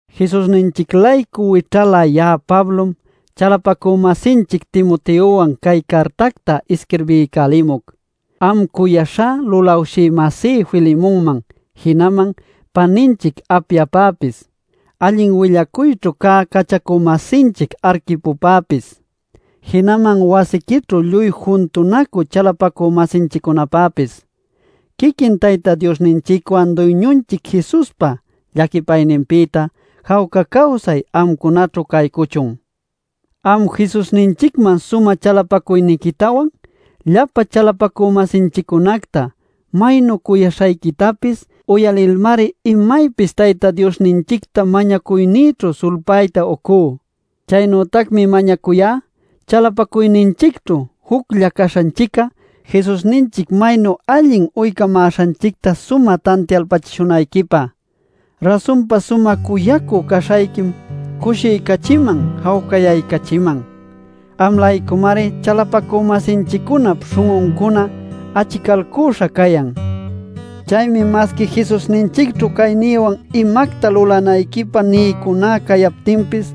Jesusninchic-laycu wićhalä ya'a Pablom chalapacü-masinchic Timoteowan cay cartacta isquirbiycälimuc am cuyaśhá lulawshï-masí Filemonman jinaman paninchic Apiapäpis, allin willacuyćhu cä cachacu-masinchic Arquipopäpis, jinaman wasiquićhu lluy juntunacü chalapacü-masinchiccunapäpis. Quiquin Tayta Diosninchicwan Duyñunchic Jesuspa llaquipayninpïta jawca cawsay amcunaćhu caycuchun. Am Jesusninchicman sumä chalapacuyniquitawan llapa chalapacü-masinchiccunacta maynu cuyaśhayquitapis uyalilmari imaypis Tayta Diosninchicta mañacuynïćhu sulpäta uycú. Chaynütacmi mañacuyá chalapacuyninchicćhu juclla caśhanchic'a Jesusninchic maynu allin uycamäśhanchicta sumä tantialpachishunayquipä. Rasunpa sumä cuyacü caśhayquim cushiycachiman jawcayaycachiman. Am-laycumari chalapacü-masinchiccunap śhun'uncuna achicalcüśha cayan. Chaymi, masqui Jesusninchicćhu caynïwan imacta lulanayquipä niycuná cayaptinpis,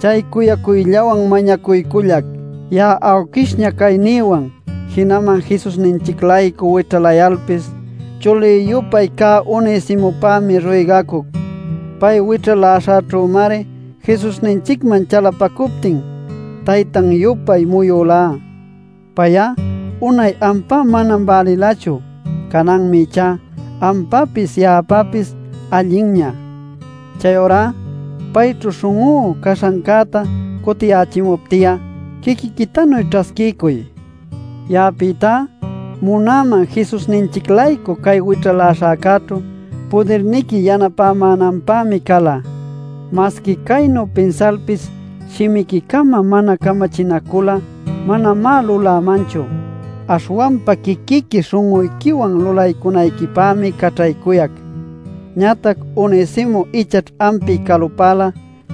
chay cuyacuyllawan mañacuycullac. Ya'a awquishña caynïwan, jinaman Jesusninchic-laycu wićhalayalpis, chuli-yupay cä Onesimopämi ruygacuc. Pay wićhaläśhäćhümari Jesusninchicman chalapacuptin taytan-yupay muyulá. Pay'a unay ampä manam bälilachu. Cananmi ichá ampäpis ya'apäpis allinña. Chayurá payćhu śhun'ú caśhancäta cutiyächimupti'a, quiquïtanuy ćhasquiycuy. Ya'apïtá munäman Jesusninchic-laycu cay wićhaläśhäcäćhu pudirniqui yanapämänanpämi cala. Masqui caynu pinsalpis shimiqui-cama mana camachinacul'a manamá lulämanchu. Aśhwanpa quiquiqui śhun'uyquiwan lulaycunayquipämi caćhaycuyac. Ñatac Onesimo ichaćh ampi calupäla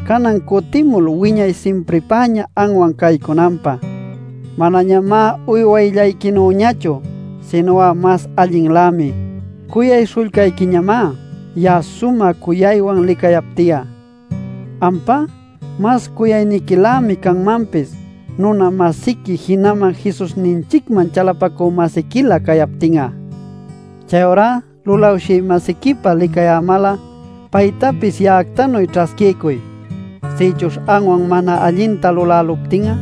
canan cutimul wiñay simpripäña anwan caycunanpä. Manañamá uywayllayquinüñachu, sinu'a mas allinlämi; cuyay śhullcayquiñamá. Ya'a sumä cuyaywan licayapti'a, ampá mas cuyayniquilämi canmanpis nuna-masiqui jinaman Jesusninchicman chalapacü-masiquilä cayaptin'a. Chayurá lulawshï-masiquipa licayämal'a, paytapis ya'actanuy ćhasquiycuy. Sïchuśh anwan mana allinta luläluptin'a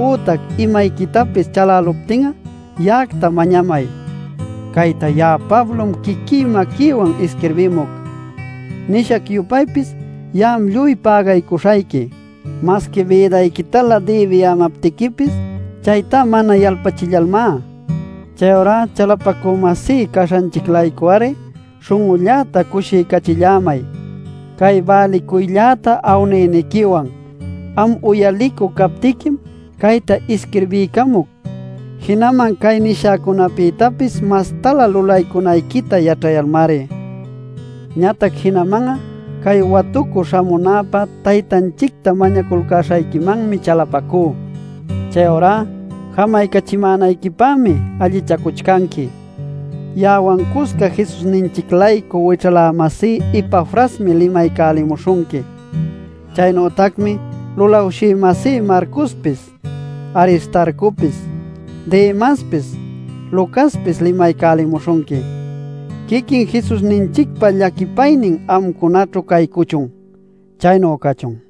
ütac imayquitapis chaläluptin'a ya'acta mañamay. Cayta ya'a Pablom quiquí maquïwan isquirbimuc: “Nishac-yupaypis ya'am lluy pägaycuśhayqui” masqui bïdayquitalä dïbiyämaptiquipis chayta mana yalpachillalmá. Chayurá chalapacü-masí caśhanchic-laycu-ari śhun'ulläta cushiycachillämay cay bälicuylläta awniyniquiwan. Am uyalicü captiquim cayta isquirbiycamuc, jinaman cay nishäcunäpïtapis mastalä lulaycunayquita yaćhayalmari. Ñatac jinaman'a, cay watucü śhamunäpä Taytanchicta mañaculcäśhayquimanmi chalapacú. Chayurá jamaycachimänayquipämi allichacuchcanqui. Ya'awan cusca Jesusninchic-laycu wićhalä-masí Epafrasmi limaycamuśhunqui. Chaynütacmi lulawshï-masí Marcospis, Aristarcopis, Demaspis, Lucaspis limaycälimuśhunqui. Quiquin Jesusninchicpa llaquipaynin amcunaćhu caycuchun. Chaynu cachun.